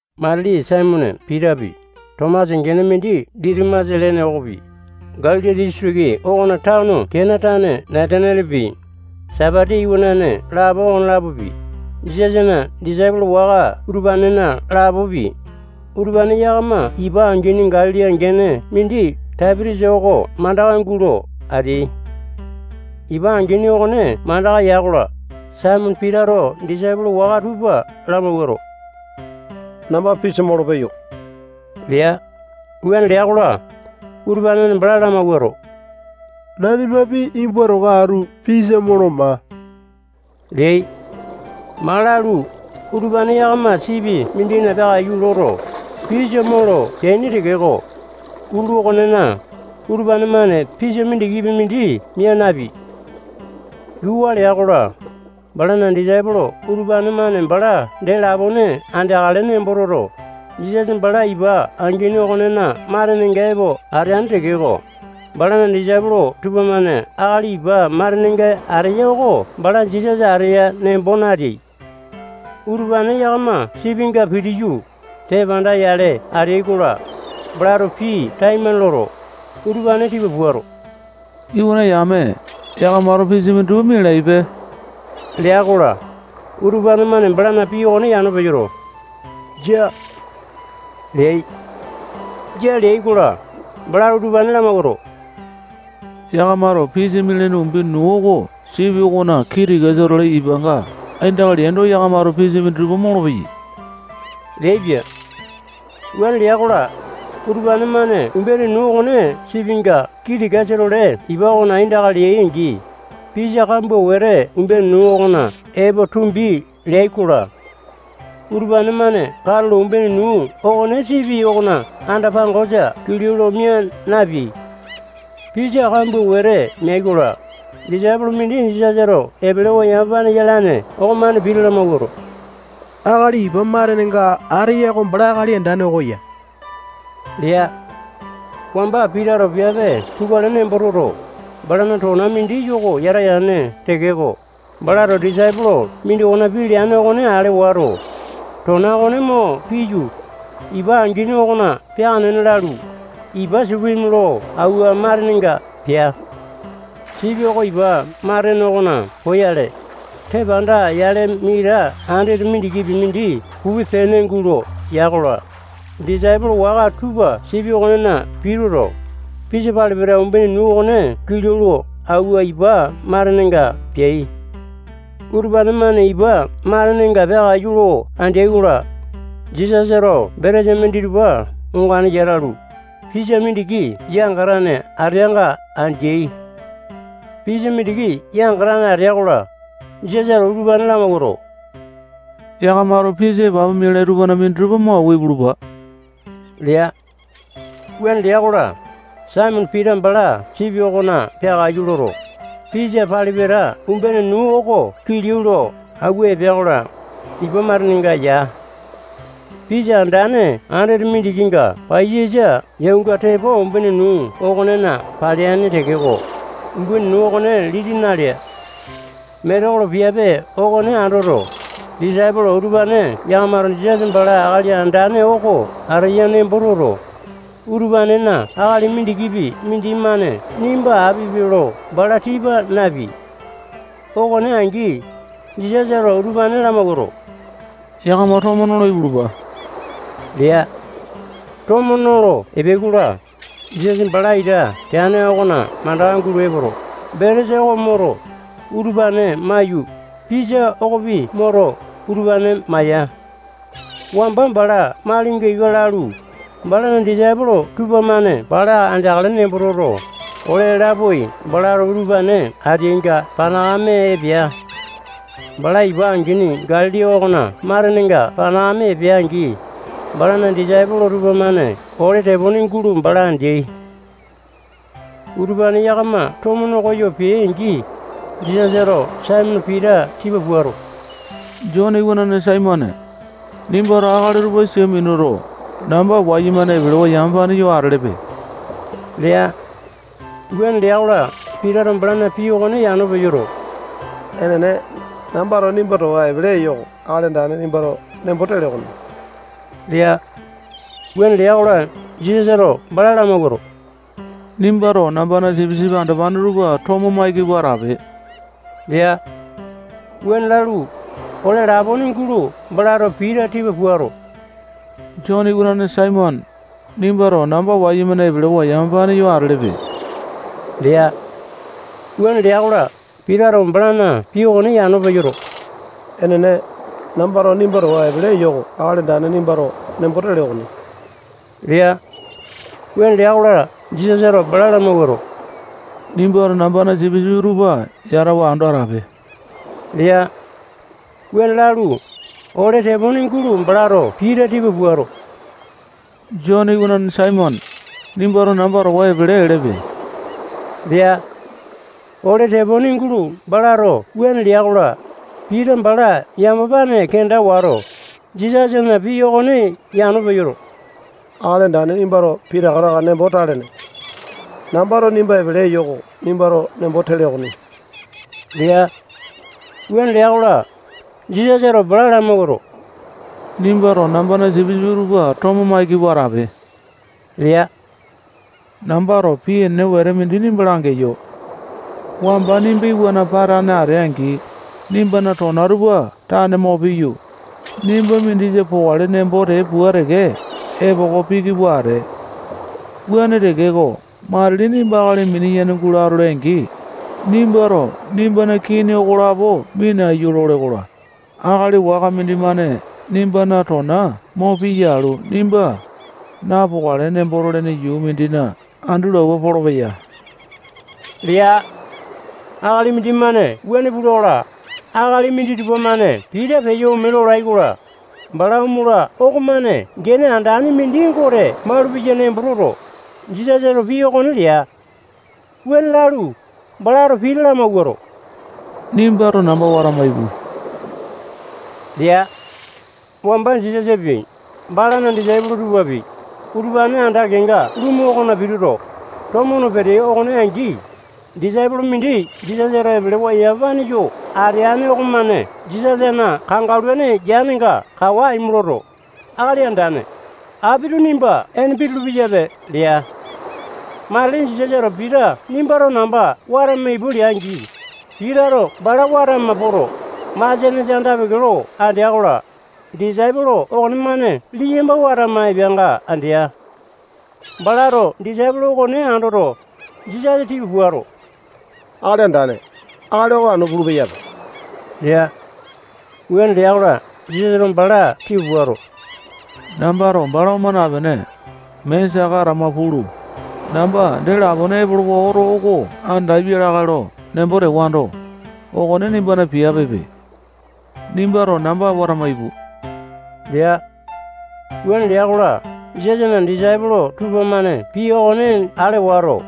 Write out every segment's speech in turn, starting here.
Matili Saimone Pitapi, Tomasa gene mindi Ditimasa lene okopi, Galili disitiki okona tano Kena tane Natanialepi, Sepiti iwanane lapo okolapopi, Jisasana disaipolo waka utupanena lapopi, utupane yakama ipa angini Galili gene mindi Taipi-tiasa oko mandaka gulo ateai. Ipa angini okone mandaka ya-kola, Saimone Pitato disaipolo waka tupa lamawuato, namba pisa molo peyo lea. Wuane lea-kola, utupane-mane bala lamawuato, nanimapi nimba towa atu pisa molo maa leai. Maa lalu, utupane yakama sipi mindina peakaiyu loto, pisa molo peaini tekeko, utulu okonena, utupane-mane pisa mindikipi mindi mia napeai. Yuu waa lea-kola, balana disaipolo utupane-mane bala dee lapone andeakale nembo toto, Jisasa bala ipa angini okonena matenenga epo ateane tekeko, balana disaipolo tupamane akali ipa matenenga ateya oko bala Jisasa ateya nembo nateai. Utupane yakama sipinga pitiyu, tepanda-yale ateai-kola, balato pii taimane loto, utupane tipa puato, iwana yame, yakamato pisa minditupa mialaipe lea-kola, utupane-mane balana pii okone yano peyoto, jia leai. Jia leai-kola, balato utupane lamawuato, yakamato pisa mialaini umbene nuu oko sipi okona kii tikasa-tole ipanga aindaka leaindo, yakamato pisa minditupa molopeyai leaipia. Wuane lea-kola, utupane-mane umbene nuu okone sipinga kii tikasa-tole ipa okona aindaka leai-angi, pisa kambua wete umbene nuu okona epo tumbi leai-kola, utupane-mane katulo umbene nuu okone sipi okona anda-pangosa kilau lo mia napeai. Pisa kambua wete meai-kola, disaipolo mindi Jisasato epelewa yamapane yalane okomane Pita lamawuato, akali ipa matenenga ateya oko bala Akali Andane oko ya lea. Wamba Pitato piape pukale nembo toto, balana tona mindi yoko yata yane tekeko, balato disaipolo mindokona pii leane okone ale wato, tona okone mo piyu, ipa angini okona peaka nena lalu, ipa supimi lo awua matenenga pea. Sipi oko ipa matene okona poyale, tepanda yale mita andete mindikipi mindi pupe-pene gulo ya-kola, disaipolo waka tupa sipi okonena pituto, pisa pali-pata umbene nuu okone kilau lo awua ipa matenenga peai. Utupane-mane ipa matenenga peakaiyu lo andeai-kola, Jisasato betesa minditupa ongane yata alu, pisa mindiki yangatane ateanga andeai. Pisa mindiki yangatane atea-kola, Jisasato utupane lamawuato, yakamato pisa epapu mialai tupana minditupa mo awua ipulupa lea. Wuane lea-kola, Saimone Pita bala sipi okona peakaiyu loto, pisa pali-pata umbene nuu oko kilau lo awua epea-kola, ipa matenenga ya. Pisa andane andete mindikinga paiyasa yaunga tepo umbene nuu okonena paleaini tekeko, umbene nuu okone liti nalea. Metekolo piape okone andoto, disaipolo utupane yakamato Jisasa bala Akali Andane oko ateya nembo toto, utupanena akali mindikipi mindimane nimba apipe lo bala tipa napeai. Okone angi, Jisasato utupane lamawuato, yakama tomo nolo ipulupa lea. Tomo nolo epeai-kola, Jisasa bala ita teane okona mandaka gulo epoto, betesa oko moto, utupane maiyu, pisa okopi moto, utupane maya. Wamba bala malinga ika lalu, balana disaipolo tupamane bala andeakale nembo toto, ole lapoai balato utupane ateainga panakame epea. Bala ipa angini Galili okona matenenga panakame epea-angi, balana disaipolo tupamane ole tepone gulo bala andeai. Utupane yakama tomo nokoyo peai-angi, Jisasato Saimone Pita tipa puato, Jone iwanane Saimone, nimbato akali utupa sia minuto, namba wayumane epelewa yamapane yo atelepe lea. Wuane lea-kola, Pitato balana pii okone yano peyoto, enene, nambato nimba towa epele eyo oko Akali Andane nimbato nembo tele okoni lea. Wuane lea-kola, Jisasato bala lamawuato, nimbato nambana sipisipi andopane tupa tomo maiki pua atape lea. Wuane lalu, ole lapone gulo balato Pita tipa puato, Jone iwanane Saimone, nimbato namba wayumane epelewa yamapane yo atelepe lea. Wuane lea-kola, Pitato balana pii okone yano peyoto, enene, nambato nimba towa epele eyo oko Akali Andane nimbato nembo tele okoni lea. Wuane lea-kola, Jisasato bala lamawuato, nimbato nambana sipisipi tupa yatawa ando atape lea. Wuane lalu, ole tepone gulo balato Pita tipa puato, Jone iwanane Saimone, nimbato namba towa epele elepe lea. Ole tepone gulo balato wuane lea-kola, Pita bala yamapane kenda wato, Jisasana pii okone yano peyoto, Akali Andane nimbato pitaka taka nembo talene. Nambato nimba epele eyo oko nimbato nembo tele okoni lea. Wuane lea-kola, Jisasato bala lamawuato, nimbato nambana sipisipi tupa tomo maiki pua atape lea. Nambato pii enene wete mindi nimba langeyo. Wamba nimba iwana patane atee-angi, nimbana tona tupa tane mo piyu, nimba mindisa pokale nembo tee pua teke epoko piki pua atee. Wuane tekeko, matili nimba akali mini-yene gulo atole-angi, nimbato nimbana kini okolapo minaiyu lole-kola, akali waka mindimane nimbana tona mo piya alu, nimba napokale nembo tolene yuu mindina andi lo awua polopeya lea. Akali mindimane wuane pula-kola, akali minditupa-mane Pita peyo ome lolai-kola, bala omola okomane gene andane mindi Gote malupeya nembo toto, Jisasato pii okone lea. Wuane lalu, balato Pita lamawuato, nimbato namba watama ipu lea. Wamba Jisasapi, balana disaipolo tupapi, utupane anda kenga lumu okona pituto, tomo no peteai okone angi, disaipolo mindi Jisasato epelewa yamapane yo ateane okomane Jisasana kangaluane yanenga kawa aimo loto, Akali Andane, apito nimba ene pitulu-peyape lea. Matili Jisasato Pita nimbato namba watama ipu lea-angi, Pitato bala watama poto, masianesa anda-peke lo andea-kola, disaipolo okonemane liyamba watama epeanga andea. Balato disaipolo okone andoto, Jisasa tipa puato, Akali Andane, akali oko anu pulu-peyape lea. Wuane lea-kola, Jisasato bala tipa puato, nambato bala oma napene, mee saka atama pulu, namba dee lapone epolowa oto oko andapia lakae lo nembo tewando, okone nimbana piapepe. Nimbato namba watama ipu lea. Wuane lea-kola, Jisasana disaipolo tupamane pii okone ale wato,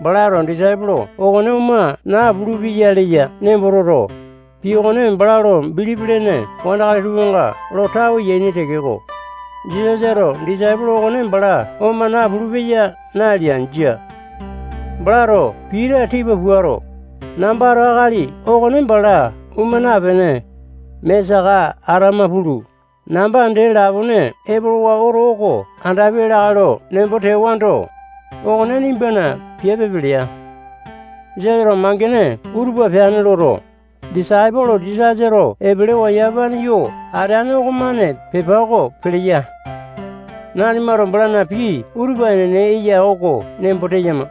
balato disaipolo okone oma napulu-peya leya nembo toto, pii okone bala lo bilipi lene wandakali tupanga lo tawe yaini tekeko, Jisasato disaipolo okone bala oma napulu-peya nalea. Jia. Balato Pita tipa puato, nambato akali okone bala oma napene, mee saka atama pulu, namba dee lapone epolowa oto oko andapia lakae lo nembo tewando, okone nimbana piapepe lea. Jisasato mangene utupa peane loto, disaipolo Jisasato epelewa yamapane yo ateane okomane pepa oko peleya. Nanimato balana pii utupa enene eya oko nembo teyama.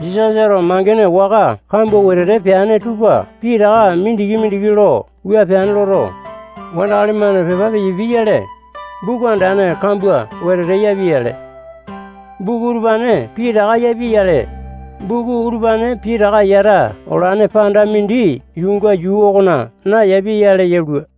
Jisasato mangene waka kambua wetete peane tupa pitaka mindiki-mindiki lo wua peane loto, wandakali-mane pepa peyapiai-yale, buku andane kambua wetete yapiai-yale. Buku utupane pitaka yapiai-yale, buku utupane pitaka yata olane panda mindi yuunga yuu okona nayapia-yale yalua.